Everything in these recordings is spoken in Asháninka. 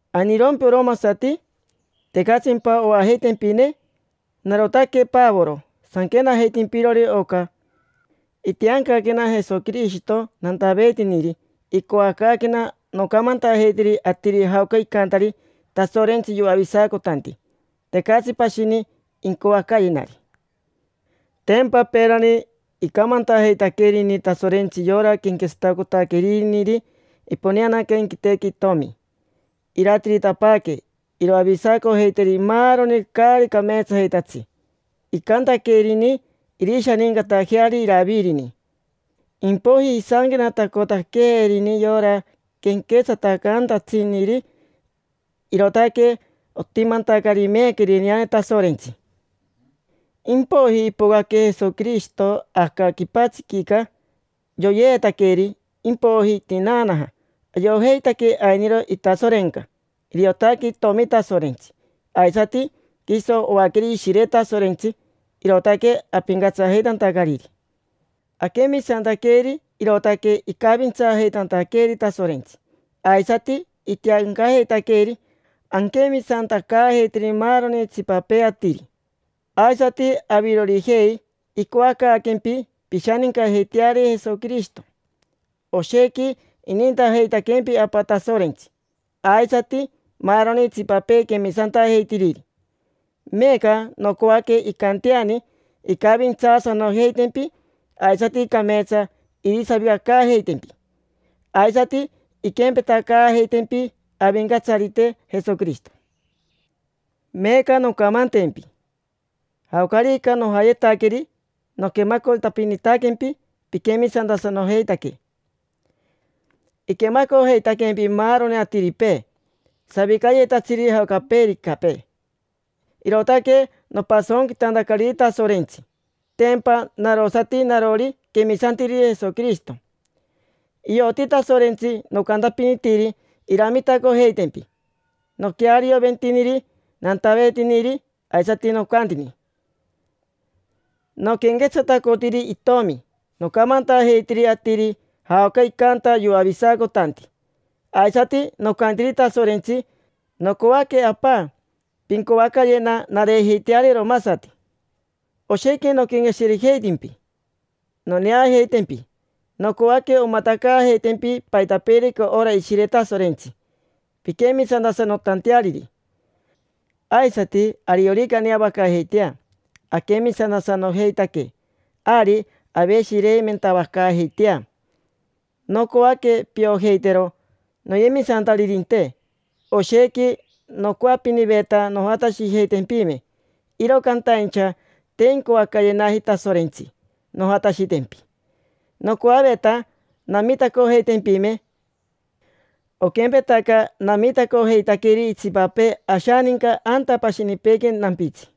¿Ainirompi oromasati? ¿Tecatsimpa oajeitempine? Narotaque Pavoro sanquenajeitimpirori oca. Itiancaquena Jesoquirishito nantaveetiniri. Icoacaaquena noncamantajeiteri atiri jaoca icantari Tasorentsi yoavisacotanti. Tecatsi pashini incoacayenari. Tempa peerani icamantajeitaquerini Tasorentsi yora quenquetsatacotaqueriniri imponeaquea inquitequi Itomi, irantiritapaaque, iroavisacojeiteri maaroni caari cameetsajeitatsi. Icantaquerini irishanincatajeari Iravirini. Impoiji isanquenatacotaquerini yora quenquetsatacantatsiniri, irootaque otimantacari meeca irineane Tasorentsi. Impoiji ipocaque Jesoquirishito aca quipatsiquica, yoyeetaqueri, impoiji itinaanaja. Ayojeitaque ainiro itasorenca, iriotaque itomi Tasorentsi, aisati quiso oaqueri Ishire Tasorentsi. Irootaque apincatsajeitantacariri. Aquemisantaqueri, irootaque icavintsaajeitantaqueeri Tasorentsi, aisati itiancajeitantaqueeri anquemisantacaajeiteri maaroni itsipapee atiri. Aisati avirorijei, icoacaaquempi pishanincajeiteari Jesoquirishito. Oshequi inintajeitaquempi Apa Tasorentsi, aisati maaroni itsipapee quemisantajeitiriri. Meeca nocoaque incanteani incavintsaasanojeitempi, aisati cameetsa irisavicacaajeitempi. Aisati inquempetacaajeitempi Avincatsarite Jesoquirishito. Meeca noncamantempi: jaocarica nojayetaqueri noquemacotapinitaquempi piquemisantasanojeitaque. Iquemacojeitaquempi maaroni atiripee, savicayetatsiri jaocaricapee, irootaque nopasonquitantacariri Tasorentsi, tempa narosati narori quemisantiriri Jesoquirishito. Ioti Tasorentsi nocantapinitiri iramitacojeitempi. Noquearioventiniri nantaveetiniri, aisati nocantani noquenquetsatacotiri Itomi: nocamantajeitiri atiri jaoca icanta yoavisacotanti. Aisati nocantiri Tasorentsi: “Nocoaque, Apa, pincoacayena nareejeiteari oromasati”. Oshequi noquenqueshirejeitimpi noneajeitempi: nocoaque omatacaajeitempi paitapeerica ora Ishire Tasorentsi, pinquemisantasanotanteariri. Aisati ariorica aneavacaajeitea aquemisantasanojeitaque, ari aveshireimentavacaajeitea. Nocoaque piojeitero, noyemisantaririnte, oshequi nocoapiniveta nojatashijeitempime, iro cantaincha te incoacayenaji Tasorentsi nojatashitempi. Nocoaveta namitacojeitempime, oquempetaca namitacojeitaqueri itsipapee ashaninca anta pashinipeequi nampitsi.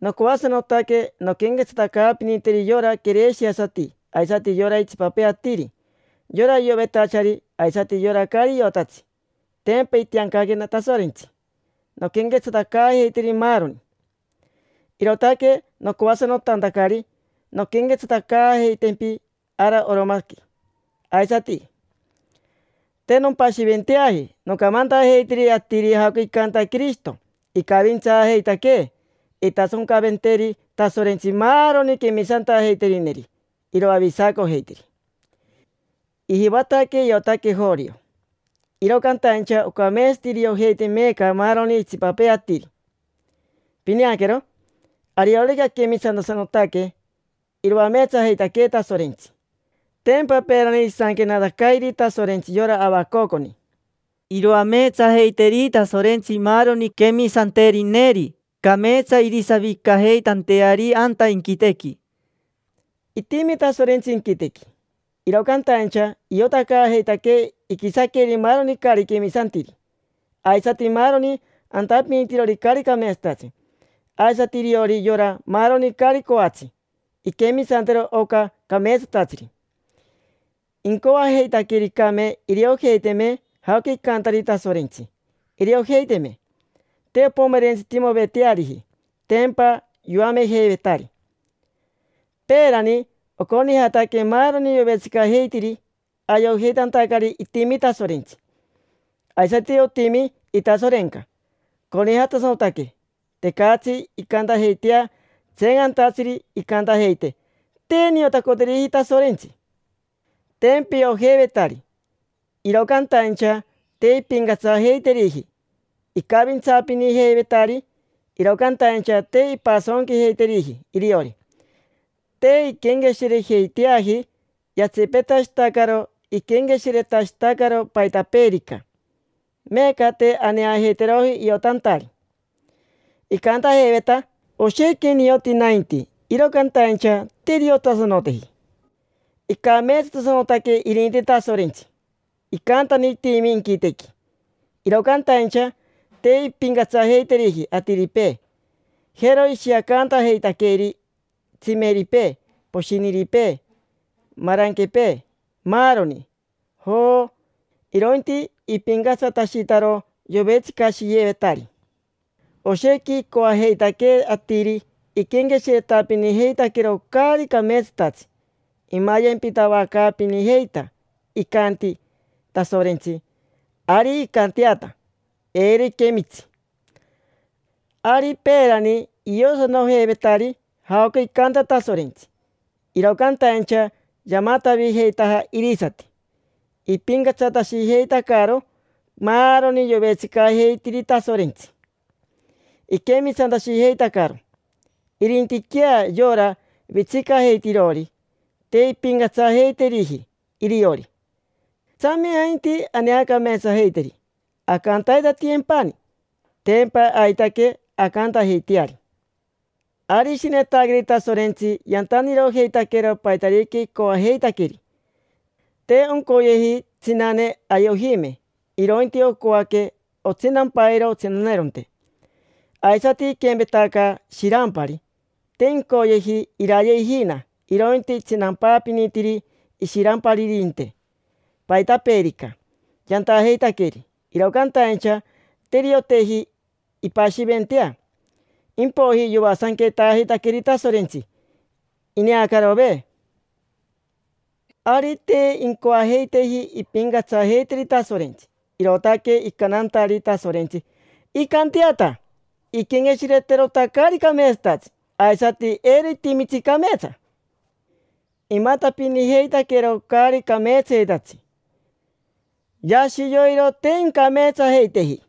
Nocoasanotaque nonquenquetsatacaapiniteri yora quereshiasati aisati yora itsipapee atiri; yora iovetachari aisati yora caari iotatsi. Tempa itiancaquena Tasorentsi nonquenquetsatacaajeiteri maaroni. Irootaque nocoasanotantacari nonquenquetsatacaajeitempi ara Oromaqui aisati. Te nompashiventeaji nocamantajeitiri atiri jaoca icanta Quirishito icavintsaajeitaquee. Intasoncaventeri Tasorentsi maaroni quemisantajeiterineri, iroavisacojeiteri. Ijivataque iotaque jorio, iro cantaincha ocameetsati iriojeite meeca maaroni itsipapee atiri. Pineaquero, ariorica anquemisantasanotaque, iroameetsajeitaquee Tasorentsi. Tempa peerani isanquenatacairi Tasorentsi yora Avacoconi: “Iroameetsajeiteri Tasorentsi maaroni quemisanterineri, cameetsa irisavicajeitanteari anta inquitequi”. Itimi Tasorentsi inquitequi, iro cantaincha iotacaajeitaquee iquisaqueri maaroni caari quemisantiri, aisati maaroni antapinitirori caari cameetsatatsi, aisati iriori yora maaroni caari coatsi inquemisantero oca cameetsatatsiri. Incoajeitaquericame iriojeiteme jaoca icantari Tasorentsi, iriojeiteme. Te ompomerentsitimoveteariji, tempa yoamejeivetari. Peerani oconijataque maaroni yovetsicajeitiri, ayojeitantacari itimi Tasorentsi, aisati otimi itasorenca. Conijatasanotaque. Tecatsi incantajeitea tseencantatsiri incantajeite: “Te niotacoteriji Tasorentsi”. Tempa iojeivetari, iro cantaincha te impincatsajeiteriji. Icavintsaapinijeivetari, iro cantaincha te impasonquijeiteriji iriori. Te inquenqueshirejeiteaji: yatsipetashitacaro iquenqueshiretashitacaro paitapeerica; meeca te aneajeiteroji iotantari. Icantajeiveta: “Oshequi nioti nainti”, iro cantaincha te iriotasanoteji. Icameetsatasanotaque irinti Tasorentsi, icantani itimi inquitequi, iro cantaincha te impincatsajeiteriji atiripee. Jero ishiacantajeitaqueri tsimeripee, poshiniripee, maranquepee, maaroni: joo, irointi ipincatsatashitaro yovetsicashiyevetari. Oshequi icoajeitaque atiri iquenqueshiretapinijeitaquero caari cameetsatatsi, imayempitavacaapinijeita; icanti Tasorentsi: “Ari incanteata, eiro iquemitsi”. Ari peerani iosanojeivetari jaoca icanta Tasorentsi, iro cantaincha yamatavijeitaja irisati. Ipincatsatashijeitacaro maaroni yovetsicajeitiri Tasorentsi, iquemisantashijeitacaro. Irintiquea yora vetsicajeitirori, te impincatsajeiteriji iriori. Tsame ainti aneacameetsajeiteri, ancantaitatiyempani. Tempa aitaque ancantajeiteari. Ari ishinetaqueri Tasorentsi yantanirojeitaquero paitarica icoajeitaqueri. Te oncoyeji tsinane aye ojime, irointi ocoaque otsinampairo otsinaneronte. Aisati iquempetaca shirampari: te incoyeji iraye ijina, irointi itsinampaapinitiri ishiramparirinte. Paitapeerica yantajeitaqueri, iro cantaincha te irioteji impashiventea. Impoiji yoasanquejeitaqueri Tasorentsi, ineacarove. Ari te incoajeiteji impincatsajeiteri Tasorentsi, irootaque icantantari Tasorentsi: “Incanteata. Inquenqueshireterota caari cameetsatatsi, aisati eiro itimitsi cameetsa”. Imatapinijeitaquero caari cameetsayetatsi: yashi yoiro te incameetsajeiteji,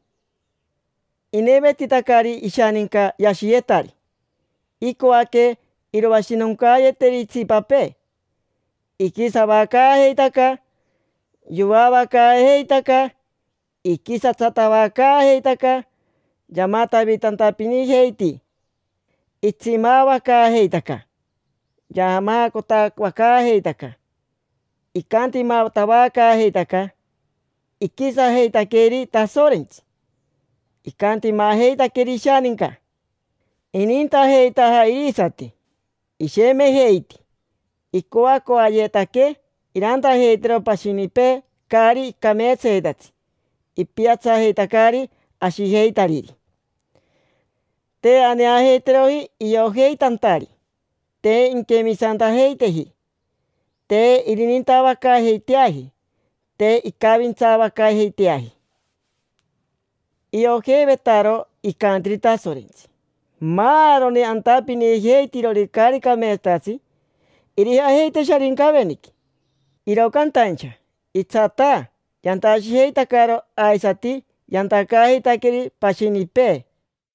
inevetitacari ishaninca yashiyetari, icoaque iroashinoncaayeteri itsipapee, iquisavacaajeitaca, yoavacaajeitaca, iquisatsatavacaajeitaca, yamatavitantapinijeiti, itsimaavacaajeitaca, yaamaacotavacaajeitaca, icantimatavacaajeitaca, iquisajeitaqueri Tasorentsi, icantimajeitaqueri ishaninca, inintajeitaja irisati, ishemejeiti, icoacoayetaque irantajeitero pashinipee caari cameetsayetatsi, ipiatsajeitacari ashijeitariri, te aneajeiteroji iojeitantari, te inquemisantajeiteji, te irinintavacaajeiteaji, te incavintsavacaajeiteaji. Iojeivetaro icantiri Tasorentsi: “Maaroni antapinijeitirori caari cameetsatatsi irijajeite Sharincaveniqui”, iro cantaincha itsataa yantashijeitacaro aisati yantacaajeitaqueri pashinipee.